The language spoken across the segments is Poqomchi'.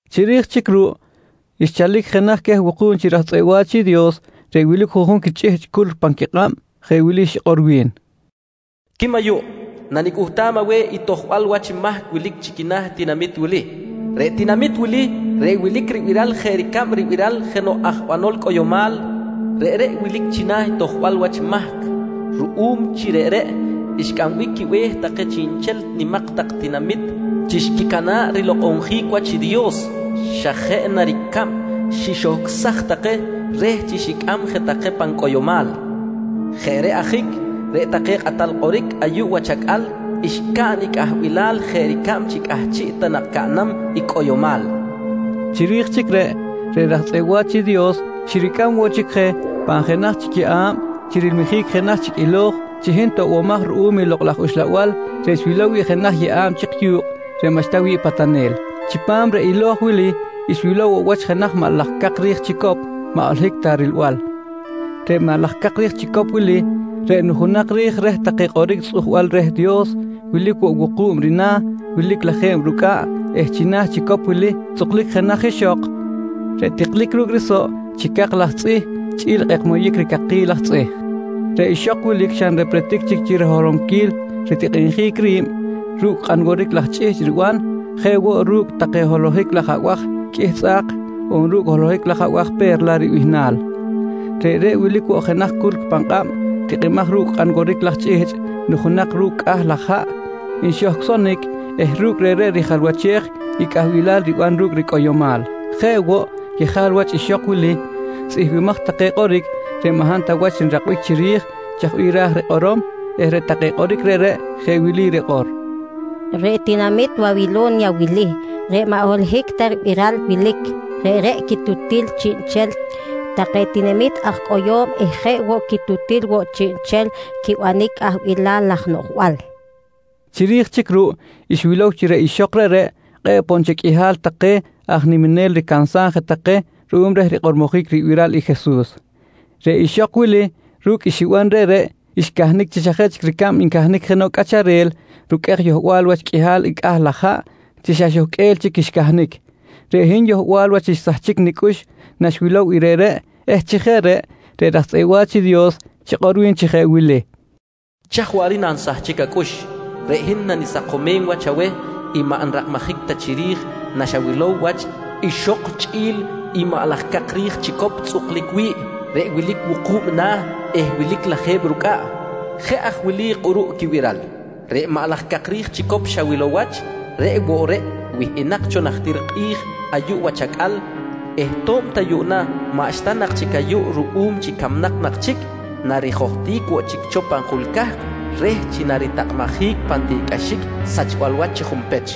Chiri̱j chic ruꞌ xchalic jenaj queh wuku̱b chi raj tzꞌeꞌ wa̱ch i Dios reꞌ wilic juꞌjun chi chꞌihchꞌ culc pan quikꞌab, jeꞌ wili xikꞌor wi̱n: «Quim ayuꞌ, nanicꞌuhtam aweh i tojbal wach mahc wilic china̱ i tinamit wili. Reꞌ tinamit wili reꞌ wilic ribiral jeꞌ ricab ribiral jenoꞌ aj banol reh cꞌoyomal reꞌreꞌ wilic china̱ i tojbal wach i mahc reꞌreꞌ ruꞌum chi reꞌreꞌ xcꞌambic quibe̱h take chiꞌnchel nimak tak tinamit chi xquicana̱ꞌ rilokꞌonjic wach i Dios, xa jeꞌ na ricab xixohcꞌsaj take reh chi xicꞌam je take pan cꞌoyomal. Jeꞌ reꞌ ajic, reꞌ take kꞌatal kꞌoric ayuꞌ wach acꞌal xcaꞌn i cꞌahbilal jeꞌ ricab chi cꞌahchiꞌ ta nak caꞌnam i cꞌoyomal, nqui wi̱n. Chiri̱j chic reꞌ, reꞌ raj tzꞌeꞌ wa̱ch i Dios xiricꞌam woꞌ chic je pan jenaj chic yeꞌa̱b chi rilmijic jenaj chic ilo̱j chi hin toꞌbomaj ruꞌum i Lokꞌ laj Uxlabal, reꞌ xwilow wi̱ꞌ jenaj yeꞌa̱b chik yu̱kꞌ reꞌ maꞌxta wi̱ꞌ patanel. Chipam reꞌ ilo̱j wili xwilow woꞌ wach jenaj maꞌ laj cak ri̱j chicop maꞌ holohic ta rilbal. Reꞌ maꞌ laj cak ri̱j chicop wili reꞌ nujunak ri̱j reh take kꞌoric tzꞌujbal reh Dios, wilic woꞌ wuku̱b rina̱, wilic lajeb rucꞌaꞌ eh china̱ i chicop wili tzꞌuklic jenaj ixok reꞌ tiklic ru̱cꞌ risoꞌ chi cak laj tzꞌih chꞌi̱l kꞌekmoyic ricakil laj tzꞌih. Reꞌ ixok wilic xa nrepretic chic riholonquil ritikꞌinjic ri̱b ru̱cꞌ kꞌan woric laj chꞌihchꞌ riban, jeꞌ woꞌ reꞌ ru̱cꞌ take holohic laj abaj qꞌuih tzꞌa̱k on ru̱cꞌ holohic laj abaj “Pe̱rla” ribihnal. Reꞌreꞌ wilic woꞌ jenaj culc pan kꞌab tikꞌimaj ru̱cꞌ kꞌan woric laj chꞌihchꞌ nujunak ru̱cꞌ cꞌah laj haꞌ nxohcꞌsonic eh ru̱cꞌ reꞌreꞌ rijalwachej i cꞌahbilal riban ru̱cꞌ ricꞌoyomal. Jeꞌ woꞌ, yejal wach ixok wili tzꞌihmbimaj take kꞌoric reꞌ maꞌ hab ta wach nrakbic chiri̱j chaj bih ra̱j rikꞌorom eh reꞌ take kꞌoric reꞌreꞌ jeꞌ wili rikꞌor: «Reꞌ tinamit Wawilo̱nya wili reꞌ maꞌ holohic ta ribiral wilic, reꞌreꞌ quitutil chiꞌnchel take tinamit aj cꞌoyo̱m eh jeꞌ woꞌ quitutil woꞌ chiꞌnchel quibanic cꞌahbilal laj noꞌjbal, nqui rikꞌor. Chiri̱j chic ruꞌ xwilow chi reꞌ ixok reꞌreꞌ kꞌe̱ꞌ poꞌ nchel qꞌuihal take aj niminel ricansam take je ruꞌum reh rikꞌormojic ribiral i Jesus. Reꞌ ixok wili, ru̱cꞌ i xiban reꞌreꞌ, xcahnic chi xa jeꞌ chic ricab ncahnic jenoꞌ cꞌacharel ruqꞌuej yohbal wach qꞌuihal i cꞌah laj haꞌ chi xa xohqꞌuel chic xcahnic. Reꞌ hin yohbal wach xsahchic nicꞌux naxwilow i reꞌreꞌ eh chi jeꞌ reꞌ, reꞌ raj tzꞌeꞌ wa̱ch i Dios xikꞌor wi̱n chi jeꞌ wili: «Chaj waꞌric nansahchic acꞌux? Reꞌ hin nanisakomem wach aweh i maꞌ nrakmajic ta chiri̱j naxawilow wach ixok chꞌi̱l i maꞌ laj cak ri̱j chicop tzꞌuklic wi̱ꞌ reꞌ wilic wuku̱b i na̱ eh wilic lajeb rucꞌaꞌ. Jeꞌ aj wili kꞌuruꞌ quibiral: Reꞌ maꞌ laj cak ri̱j chicop xawilow wach reꞌ woꞌ reꞌ wihꞌinak cho najtir kꞌi̱j ayuꞌ wach acꞌal eh to̱b ta yuꞌna maꞌxta nak chic ayuꞌ ruꞌum chi camnak nak chic, narijohtic woꞌ chic cho pan jul cahk reh chi naritakꞌabjic pan tiꞌcꞌaxic sachbal wach chi junpech.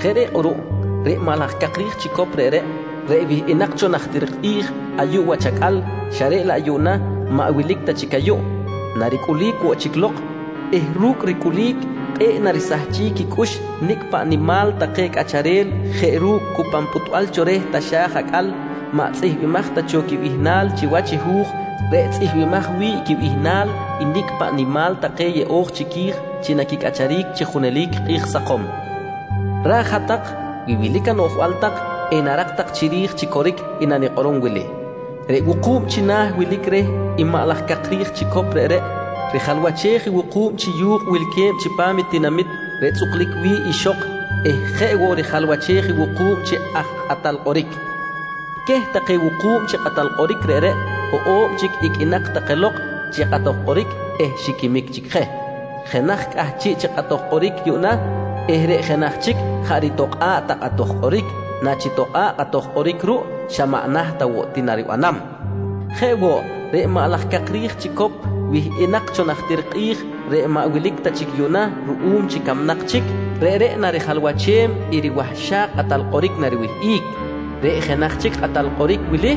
Jeꞌ reꞌ kꞌuruꞌ reꞌ maꞌ laj cak ri̱j chicop reꞌreꞌ, reꞌ wihꞌinak cho najtir kꞌi̱j ayuꞌ wach acꞌal xa reꞌ laꞌ yuꞌna maꞌ wilic ta chic ayuꞌ, naricꞌulic woꞌ chic lok eh ru̱cꞌ ricꞌulic kꞌe̱ꞌ narisahchic quicꞌux nicꞌ paꞌ nimal take cꞌacharel jeꞌ ru̱cꞌ cu pan pꞌuhtbal cho reh taxa̱j acꞌal maꞌ tzꞌihmbimaj ta cho quibihnal chiwach i hu̱j reꞌ tzꞌihmbimaj wi̱ꞌ quibihnal nicꞌ paꞌ nimal take yeꞌo̱j chiqui̱j chi naquicꞌacharic chi junelic kꞌi̱j sakom. Ra̱j hat-tak wi wilic anoꞌjbal tak enarak tak chiri̱j chi coric i nanikꞌorom wili: Reꞌ wuku̱b china̱ wilic reh i maꞌ laj cak ri̱j chicop reꞌreꞌ, rijalwachej i wuku̱b chi yu̱kꞌ wilque̱b chipam i tinamit reꞌ tzꞌuklic wi̱ꞌ ixok eh jeꞌ woꞌ rijalwachej i wuku̱b chi aj kꞌatal kꞌoric. Queh take wuku̱b chi kꞌatal kꞌoric reꞌreꞌ, hoꞌo̱b chic iqꞌuinak take lok chi kꞌatoj kꞌoric eh xiquimic chic je. Jenaj cꞌahchiꞌ chi kꞌatoj kꞌoric yuꞌna eh reꞌ jenaj chic jaꞌ ritokꞌa̱ꞌ ta kꞌatoj kꞌoric. Nachitokꞌa̱ꞌ kꞌatoj kꞌoric ruꞌ xa maꞌ naht ta woꞌ ti naribanam. Jeꞌ woꞌ, reꞌ maꞌ laj cak ri̱j chicop wihꞌinak cho najtir kꞌi̱j reꞌ maꞌ wilic ta chic yuꞌna ruꞌum chi camnak chic, reꞌreꞌ rijalwachej i riwahxak kꞌatal kꞌoric nariwihꞌic. Reꞌ jenaj chic kꞌatal kꞌoric wili,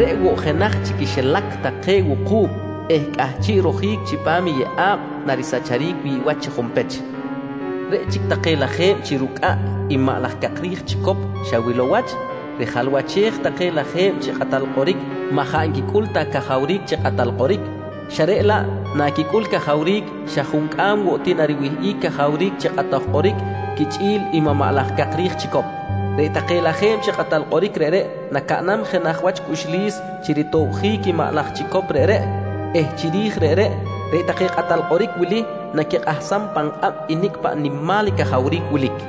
reꞌ woꞌ jenaj chi quixilac take wuku̱b eh cꞌahchiꞌ rojic chipam i yeꞌa̱b narisahchic wi̱ꞌ wach chi junpech. «Reꞌ chic take lajeb chi rucꞌaꞌ i maꞌ laj cak ri̱j chicop xawilow wach, rijalwachej take lajeb chi kꞌatal kꞌoric maꞌ jaꞌ nquicꞌul ta cajawric chi kꞌatal kꞌoric, xa reꞌ laꞌ naquicꞌul cajawric xa juncꞌam woꞌ ti nariwihꞌic cajawric chi kꞌatoj kꞌoric quichꞌi̱l i maꞌ laj cak ri̱j chicop. Reꞌ take lajeb chi kꞌatal kꞌoric reꞌreꞌ nacaꞌnam jenaj wach cꞌuxlis chi ritobjic i maꞌ laj chicop reꞌreꞌ eh chiri̱j reꞌreꞌ, reꞌ take kꞌatal kꞌoric wili naquikꞌahsam pan kꞌab i nicꞌ paꞌ nimal i cajawric wilic.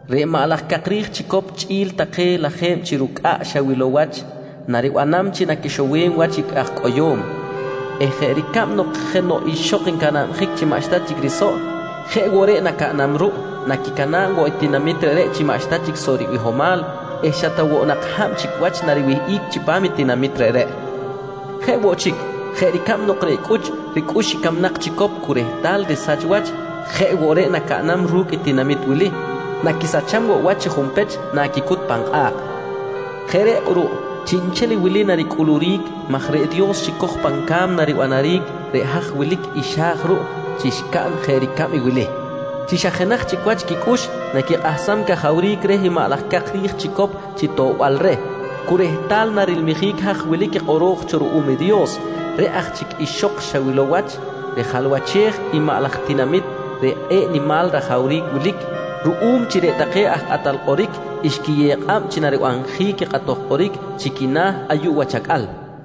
Reꞌ maꞌ laj cak ri̱j chicop chꞌi̱l take lajeb chi rucꞌaꞌ xawilow wach naribanam chi naquixowem wach i aj cꞌoyo̱m eh jeꞌ ricab nok jenoꞌ ixok ncanabjic chi maꞌxta chic risoꞌ, jeꞌ woꞌ reꞌ nacaꞌnam ruꞌ, naquicana̱b woꞌ i tinamit reꞌreꞌ chi maꞌxta chic soꞌ ribihomal eh xa ta woꞌ nak hab chic wach nariwihꞌic chipam i tinamit reꞌreꞌ. Jeꞌ woꞌ chic, jeꞌ ricab nok reꞌ cꞌuch ricꞌux i camnak chicop cu rehtal risach wach jeꞌ woꞌ reꞌ nacaꞌnam ru̱cꞌ i tinamit wili, naquisacham woꞌ wach chi junpech naquicut pan kꞌa̱kꞌ. Jeꞌ reꞌ kꞌuruꞌ chiꞌnchel wili naricꞌuluric maj reꞌ Dios xicoj pan ca̱mna ribanaric reꞌ haj wilic i xa̱j ruꞌ chi xcaꞌn jeꞌ ricab i wili: Chi xa jenaj chic wach quicꞌux naquikꞌahsam i cajawric reh i maꞌ laj cak ri̱j chicop chi toꞌbal reh, cu rehtal narinimjic haj wilic i kꞌoro̱j cho ruꞌum i Dios. Reꞌ aj chic ixok xawilow wach, rijalwachej i maꞌ laj tinamit reꞌ kꞌe̱ꞌ nimal rajawric wilic, ruꞌum chi reꞌ take aj kꞌatal kꞌoric xquiyew kꞌab chi naribanjic i kꞌatoj kꞌoric chi quina̱ ayuꞌ wach acꞌal, nqui wi̱n.